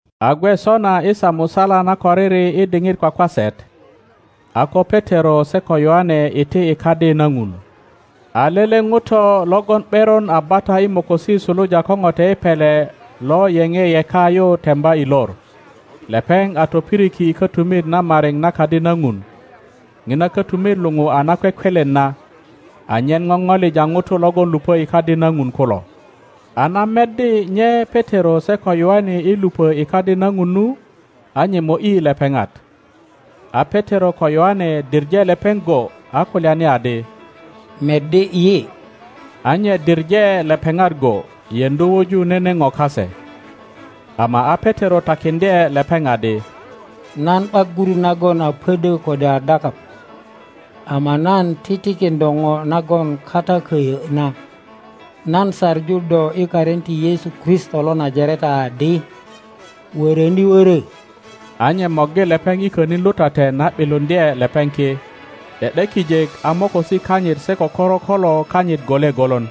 A gwe sona i saa musala nakoriri i diŋit kwakwaset, a ko Petero se ko Yoane iti i Kadi na Ŋun. A lele ŋuto logon ’beron a bata i mokosi suluja ko ŋote i pele lo yeŋ yeka yu temba i lor. Lepeŋ a topiriki i kotumit na mariŋ na Kadi na Ŋun, ŋina kötumit luŋu a Nakwekwelen na, anyen popolija ŋutu logon lupö i Kadi na Ŋun kulo. A na meddi nye Petero se ko Yoane i lupo i Kadi na Ŋun nu, a nye mo ’yi lepeŋat. a Petero ko Yoane diŋe lepeŋ go a kulyani adi, Meddi yi. A nye diŋe lepeŋat go, yeŋdu wuju nene po kase. Ama a Petero takiŋdye lepeŋ adi, Nan ’bak gurut nagon a pödö kode a dakap, ama nan titikin do po nagon kata köyö na; nan saŋu do i karin ti Yesu Kristo lo Najareta adi, Wöröni wörö! A nye morgi lepeŋ i könin lutaten a ’biluŋdye lepeŋ ki; ’de ’de kijek a mokosi kanyit se ko korokolo kanyit gole golon.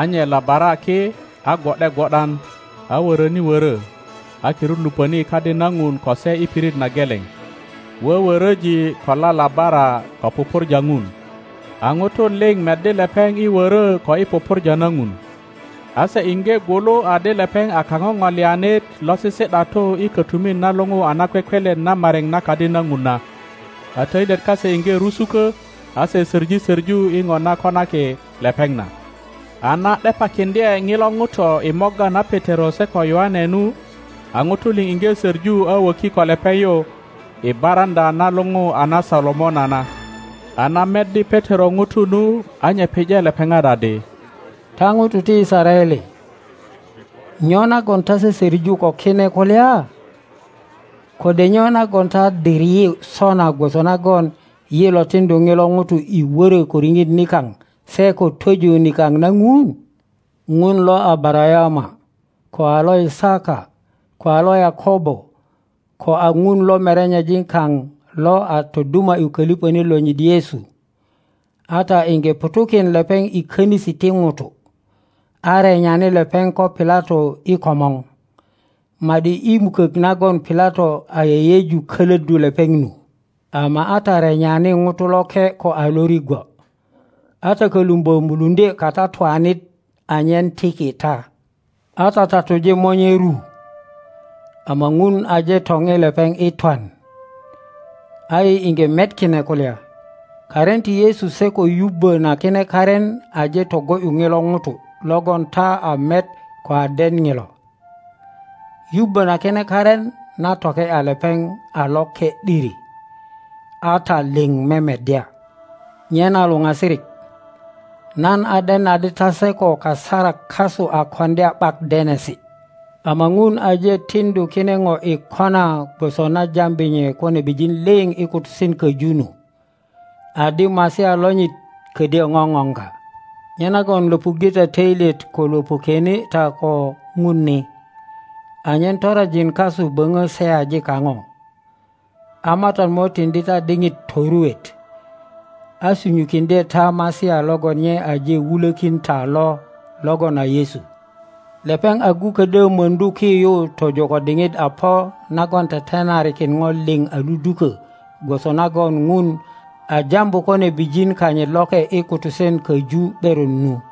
A nye labara ki, a gwo ’de gwo ’dan, a wöröni wörö, a kirut lupöni i Kadi na Ŋun ko se i pirit na geleŋ, wöwöröji ko lalabara ko pupurja Ŋun. A ŋutu liŋ meddi lepeŋ i wörö ko i pupurja na Ŋun, a se iŋge gwulu adi lepeŋ a kaŋoŋolianit lo sisi ’datu i kötumit na luŋu a Nakwekwelen na mariŋ na Kadi na Ŋun na, a töilyet kase iŋge rusukö a se soŋi soŋu i po na konaki lepeŋ na. A na ’depakiŋdye ŋilo ŋuto i morga na Petero se ko Yoane nu, a ŋutu liŋ iŋge söŋu a wöki ko lepeŋ yu i baraŋöa na luŋu a na Solomona na. A na meddi Petero ŋutu nu, a nye pije lepeŋat adi, Ta ŋutu ti Yisaraele, nyo nagon ta sösöŋu ko kine kulya? Kode nyo nagon ta dir yi sona gwoso nagon yi lo tiŋdu ŋilo ŋuto i wörö ko riŋit nikap se ko twöju nikap na Ŋun? Ŋun lo Abarayama, ko a lo Yisaka, ko a lo Yakobo, ko a Ŋun lo merenyejin kaŋ lo a toduma ’yu köliŋönit lonyit Yesu, a ta iŋge ŋutu kin lepeŋ i konisi ti ŋutu, a renyani lepeŋ ko Pilato i komor, ma ’di i mukök nagon Pilato a yeyeju kölöddu lepeŋ nu. Ama a ta renyani Ŋuto Loke ko a Lorigwo, a ta kölumbö muluŋdye katatuanit anyen tiki ta, a ta tatuje Monye ru, ama Ŋun aje topi lepeŋ i twan, a yi iŋge met kine kulya. Karin ti Yesu se ko yubbo na kine karin aje togo ’yu ŋilo ŋuto logon ta a met ko a den ŋilo. Yubbo na kine karin na toke ’ya lepeŋ a loke ’diri, a ta liŋ memeddya. Nyena luŋasirik, nan a den adi ta se ko kasarak kasu a koŋdya ’bak denesi. Ama Ŋun aje tiŋdu kine po i kona gwoso na jambi nye ko nebijin liŋ i kutusen köju nu, adi Masia lonyit ködyö ŋoŋoŋga. Nyenagon löpuŋge ta töilyet ko löpukwene ta ko Ŋun ni, anyen toronjin kasu boŋo seyaji kaŋo. A Matat mo tiŋdi ta diŋit toruet, a sunyukiŋdye ta Masia logon nye aje wulökin ta lo logon a Yesu. Lepeŋ agu ködyö möŋdu ki yu tojo ko diŋit a po nagon tetenarikin po liŋ a ludukö gwoso nagon Ŋun a jambu ko nebijin kanyit loke i kutusen köju ’beron nu.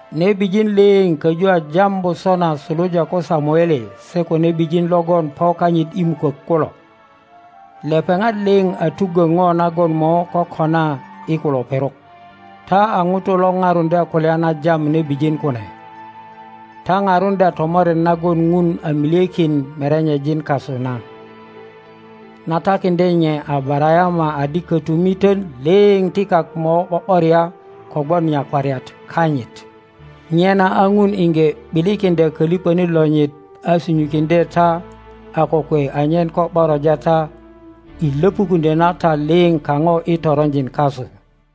Nebijin liŋ köju a jambu sona suluja ko Samuele se ko nebijin logon po kanyit i mukök kulo; lepeŋat liŋ a tuggö po nagon mo kokona i kulo perok. Taa ŋutu lo paruŋdya kulya na jam nebijin kune, ta paruŋdya tomoret nagon Ŋun a milyekin merenyejin kasu na, na takiŋdye nye Abarayama adi kötumiton liŋ ti kak mo ’bo ’boria kogwon nyakwariat kanyit. Nyena a Ŋun iŋge ’bilikiŋdya Koliŋonit lonyit a sunyukiŋdye ta a kokwe anyen ko ’boroja ta i löpukuŋdyö na ta liŋ kaŋo i toronjin kasu.